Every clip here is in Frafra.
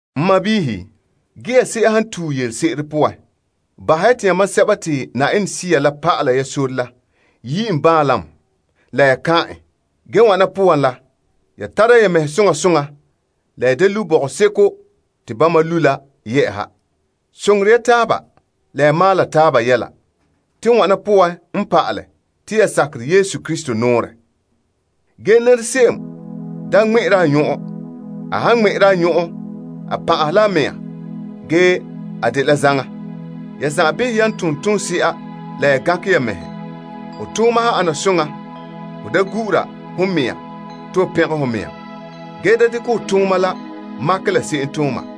N sɔɔnrɔ, ge ya se'em han tue yelese'ere, bahɛ ya te yamam sɛba te Sea la pa'ala ya sore la yi' en baanlam la ya kan'an en. Ge wana poan la, tara ya mɛhe soŋa soŋa la ya da lu' bɔgɔseko te bama lu' la yɛ'ɛha. Soŋore ya taaba la ya maala taaba yɛla, te wana poan n pa'ale te ya sakerɛ Krista nɔɔrɛ. Ge se'em da ŋmɛ'ɛra a nyɔn'ɔn. A han ŋmɛ'ɛra a nyɔn'ɔn, a pan'ahɛ la a mɛŋa ge a dela zaŋa. Ya zan'an behɛ ya tom soŋa ge gankɛ ya mɛhe. Ho tooma han ana soŋa, ho pɛngɛ ho mɛŋa. Ge da dekɛ ho tooma la makɛ la se'em tooma.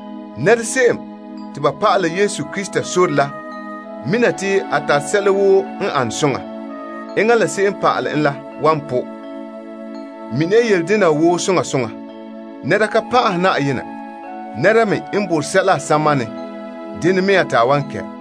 Nɛra se'em te ba pa'ala Yesu sore la mina te n tare sɛla woo n ane soŋa, enŋa la se'em n pa'ale en la wan tɔnrɛ. Mini ya yele dena wa soŋa soŋa: nɛra ka pan'ahɛ Yenɛ. Nɛra me n borɛ sɛla a samanɛ, dene mea te a wan kɛ'.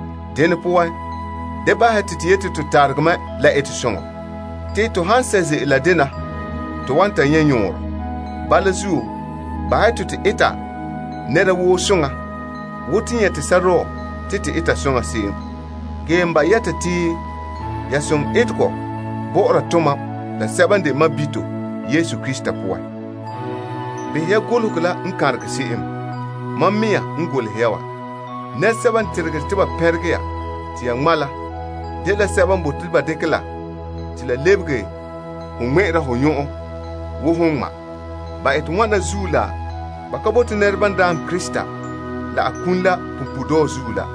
Dene poan, da bahɛ ya te to yete to tarege mɛ la etesoŋɔ. Te to han sɛ' ze'ele, la dena wa to wan ta nyɛ' yɔɔrɛ. Bala zuo, bahɛ ya te to eta nɛra woo soŋa wo te nyɛte sɔrɔɔ te to eta soŋa se'em, ge n ba'a yɛta te ya eta som etegɔ bɔ'ɔra tomam la sɛba n de sɔɔnrɔ Yesu poan. Behɛ ya golehegɔ la n kanregɛ se'em. Mam mɛŋa golehegɔ te n dekɛ goleha ya wa. Sɛba n teregere te ba pɛnregɛ ya te ya ŋma' la, dela ba bote ba dekɛ ya ŋmɛ' ba nyɔn'ɔn bo basɛba. Ban ete wana wa dela ba ka bote nɛreba n namehe ba doohe Krista n ki punpuuredɔɔ zuo yɛla la.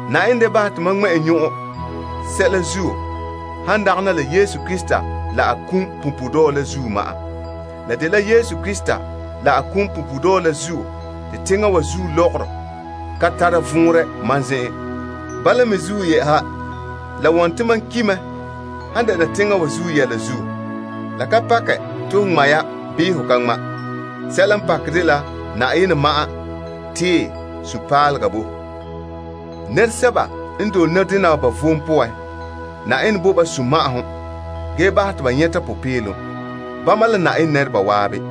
Yenɛ da bahɛ te mam ŋmɛ' nyɔn'ɔn sɛla zuo han dagana te to Daana Yesu Krista la a kum punpuuredɔɔ la zuo ma'an. Doohe a kum punpuuredɔɔ la zuo, teŋa wa zuo lɔgɔrɔ ka tara vɔnrɛ mam zen'en ge mam ki' mɛ han dɛna teŋa wa zuo. La ka pakɛ te ho ŋma' ya bii ho ka ŋma'. Sɛla n pakɛ dela Na'ayenɛ ma'an tee sunpaalega bo to. Nɛresɛba n dole nɔdena wa ba vom poan, Yenɛ bo ba sunma'ahom ge bahɛ te ba nyɛta popeelom, bama la Na'ayenɛ nɛreba zan'an.